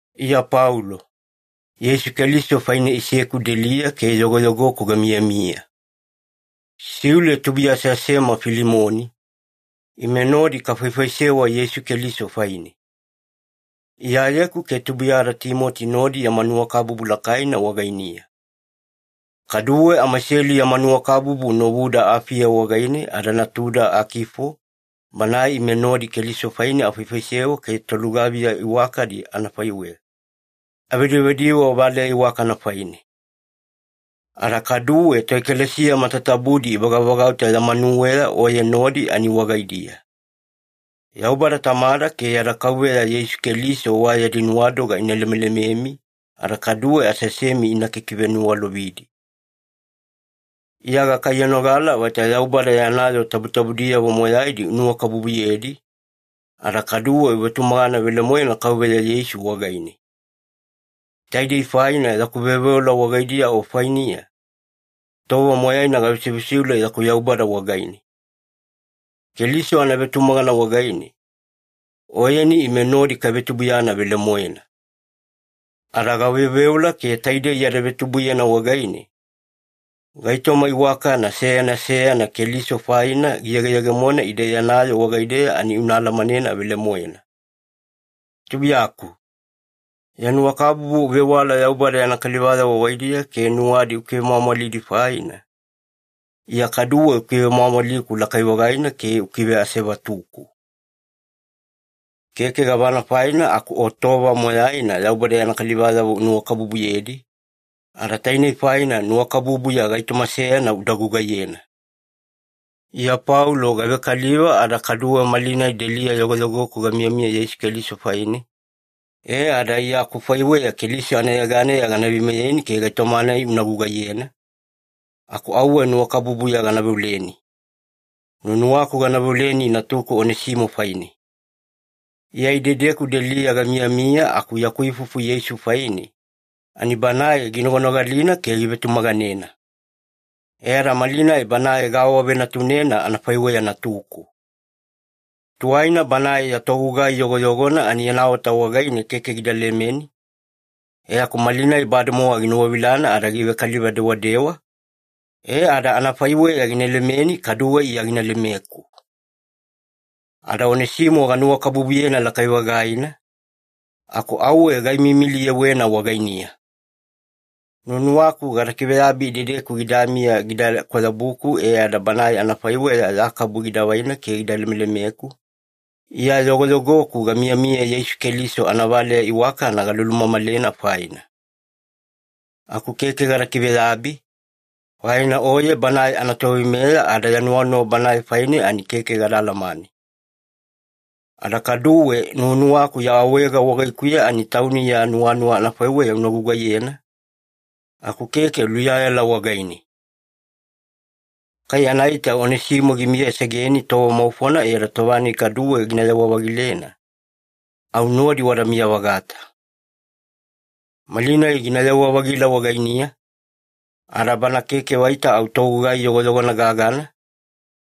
Iya Paulo. Yeisu Keliso faine iseku deliya ke yogoyogoku gamiyamiya. Siule tubuiya aseasema Filimoni, ime nodi kafaifaisewa Yeisu Keliso faine. Iyayeku ke tubuiyada Timoti nodi yama nuwakabubu lakaina wagainiya. Kaduwe amaiselu yama nuwakabubu novuda Afiya wagaine ada natuda Akifo banae ime nodi Keliso faine afaifaisewa ke tolugaviya iwakadi anafaiweya, avedivediwe valeya iwakana faine. Ada kaduwe toekalesiya matatabudi ivagavagauta ya manuweya oye nodi ani wagaidiya. Yaubada Tamada ke yada Kauveya Yeisu Keliso wa yadi nuwadoga ina lemelememi ada kaduwe aseasemi ina kikiveniwalovidi. Iya gakaiyanogala vaita Yaubada yana yoo tabutabudiyavo moyaidi unuwakabubuyedi, ada kaduwe uvetumagana velemoena Kauveya Yeisu wagaine. Taidei faina yaku veoveola wagaidiya o fainiya, tova moyaina gavesivesiule yaku Yaubada wagaine. Keliso anavetumagana wagaine, oyeni ime nodi kavetubuiyana velemoena. Ada gaveoveola ke taidei yada vetubuiyana wagaine, gaitoma iwakana seyana seyana Keliso faina giyegeyegemona ide yana yoo wagaideya ani una alamanena velemoena. Tubuiyaku, ya nuwakabubu uvewala Yaubada yana kalivayavo wagaidiya ke nuwadi ukivemwamwalidi faina, Iya kaduwe ukivemwamwaliku lakai-vagaina ke ukiveasevatuku. Keke gavana faina aku o tova moyaina Yaubada yana kalivayavo unuwakabubuyedi, ada tainei faina nuwakabubuya gaitoma seyana uda gugaiyena. Iya Paulo gavekaliva ada kaduwe malinai deliya yogoyogoku gamiyamiya Yeisu Keliso faine, e ada Iya akufaiweya Keliso anayeganeya gana veimeyeni ke gaitoma-nai una gugaiyena, aku auwe nuwakabubuya gana veoleni. Nuwanuwaku gana veoleni natuku Onesimo faine. Iya idedeku deliya gamiyamiya aku yaku ifufu Yeisu faine, ani banae ginoganogalina ke givetumaganena. E ada malinai banae gaawavenatunena anafaiweya natuku. Tuwaina banae ya togugai yogoyogona ani yana ota wagaine keke gida lemeni, e aku malinai bademowa ginuwavilana ada givekaliva dewadewa, e ada anafaiweya gina lemeni kaduwe Iya gina lemeku. Ada Onesimo ganuwakabubuyena lakai-vagaina, aku auwe gaimiimiliyewena wagainiya. Nuwanuwaku gada kiveyabi idedeku gidamiya gida kwayabuku e ada banae anafaiweya ya kabu gida vaina ke gida lemelemeku, Iya yogoyogoku gamiyamiya Yeisu Keliso anavaleya iwakana galulumamalena faina. Aku keke gada kiveyabi, faina oye banae anatoveimeya ada ya nuwanuwa banae faine ani keke gada alamane. Ada kaduwe nuwanuwaku ya awaega wagaikuya ani tauni ya nuwanuwa anafaiweya una gugaiyena, aku keke luyayala wagaine. Kai anaita Onesimo gimiyasegeni tova maufona e ada tova-nai kaduwe ginayewa-vagilena, au nodi wadamiya-vagata. Malinai ginayewa-vagila wagainiya, ada bana keke vaita au togugai yogoyogona gagana,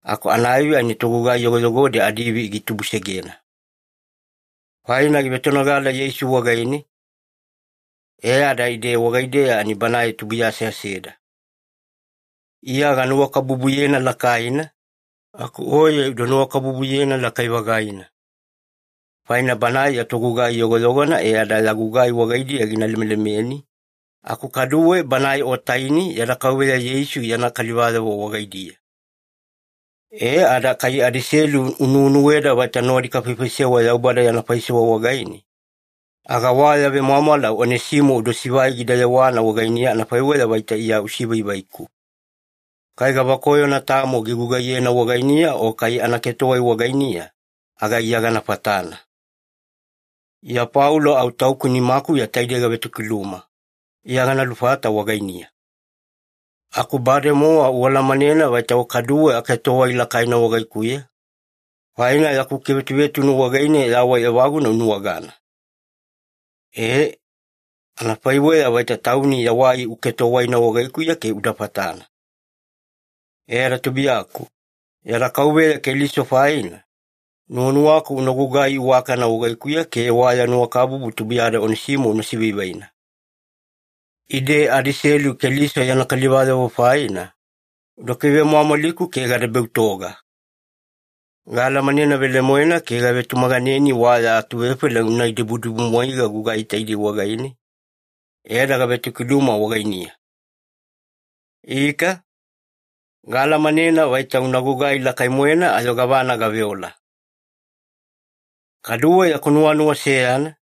aku anaivi ani togugai yogoyogodi adiivi gitubusegena. Faina givetonogala Yeisu wagaine, e ada ide wagaideya ani banae tubuiya aseaseda. Iya ganuwakabubuyena lakaina, aku oye uda nuwakabubuyena lakai-vagaina. Faina banae ya togugai yogoyogona e ada ya gugai wagaidiya gina lemelemeni, aku kaduwe banae o taini yada Kauveya Yeisu yana kalivayavo wagaidiya. E ada kai adaiselu unuwenuweda vaita nodi kafaifaisewa Yaubada yana faisewa wagaine, aga wa ya vemwamwala Onesimo uda sivai gida yewana wagainiya anafaiweya vaita Iya usivaivaiku. Kai gavakoyona tamo gigugaiyena wagainiya o kai anaketowai wagainiya, aga Iya gana fatana. Iya Paulo au tauku nimakuya taidei gavetokiluma: Iya gana lufata wagainiya. Aku bademowa ualamanena vaita o kaduwe aketowai lakaina wagaikuya, faina yaku kivetuvetunu wagaine yawai evaguna unuwagana. Ee, anafaiweya vaita tauni yawai uketowaina wagaikuya ke uda fatana. E ada tubuiyaku, yada Kauveya Keliso faina, nuwanuwaku una gugai iwakana wagaikuya ke wa ya nuwakabubu tubuiyada Onesimo una sivaivaina. Ide adaiselu Keliso yana kalivayavo faina, uda kivemwamwaliku ke gada beutoga. Gaalamanena velemoena ke gavetumaganeni wa ya atuvefaila una idibudibumwaiga gugai taidei wagaine, e ada gavetokiluma wagainiya. Ika, gaalamanena vaita una gugai lakai-moena ayo gavana gaveola. Kaduwe yaku nuwanuwa seyana.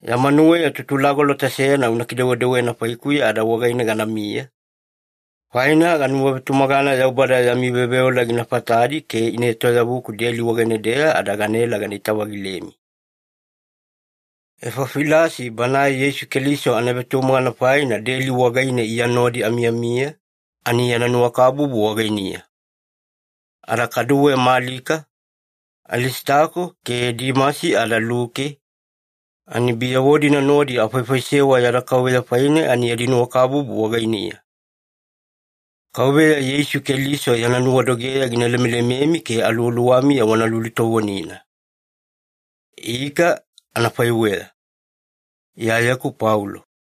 Ya manuweya tutulagolota seyana una kidewedewena faikuya ada wagaine ganamiya, faina ganuwavetumagana Yaubada yami veoveola gina fatadi ke ina etoyavuku deli wagaine-deya ada ganaela ganaita-vagilemi. Efafilasi banae Yeisu Keliso anavetumagana faina deli wagaine Iya nodi amiyamiya, ani yana nuwakabubu wagainiya. Ada kaduwe Malika, Alisitako ke Dimasi ada Luke, ani biyavo-dina nodi afaifaisewa yada Kauveya faine ani yadi nuwakabubu wagainiya. Kauveya Yeisu Keliso yana nuwadogeya gina lemelememi ke aluwaluwamiya wana lulutovonina. Ika, anafaiweya. Iyayeku Paulo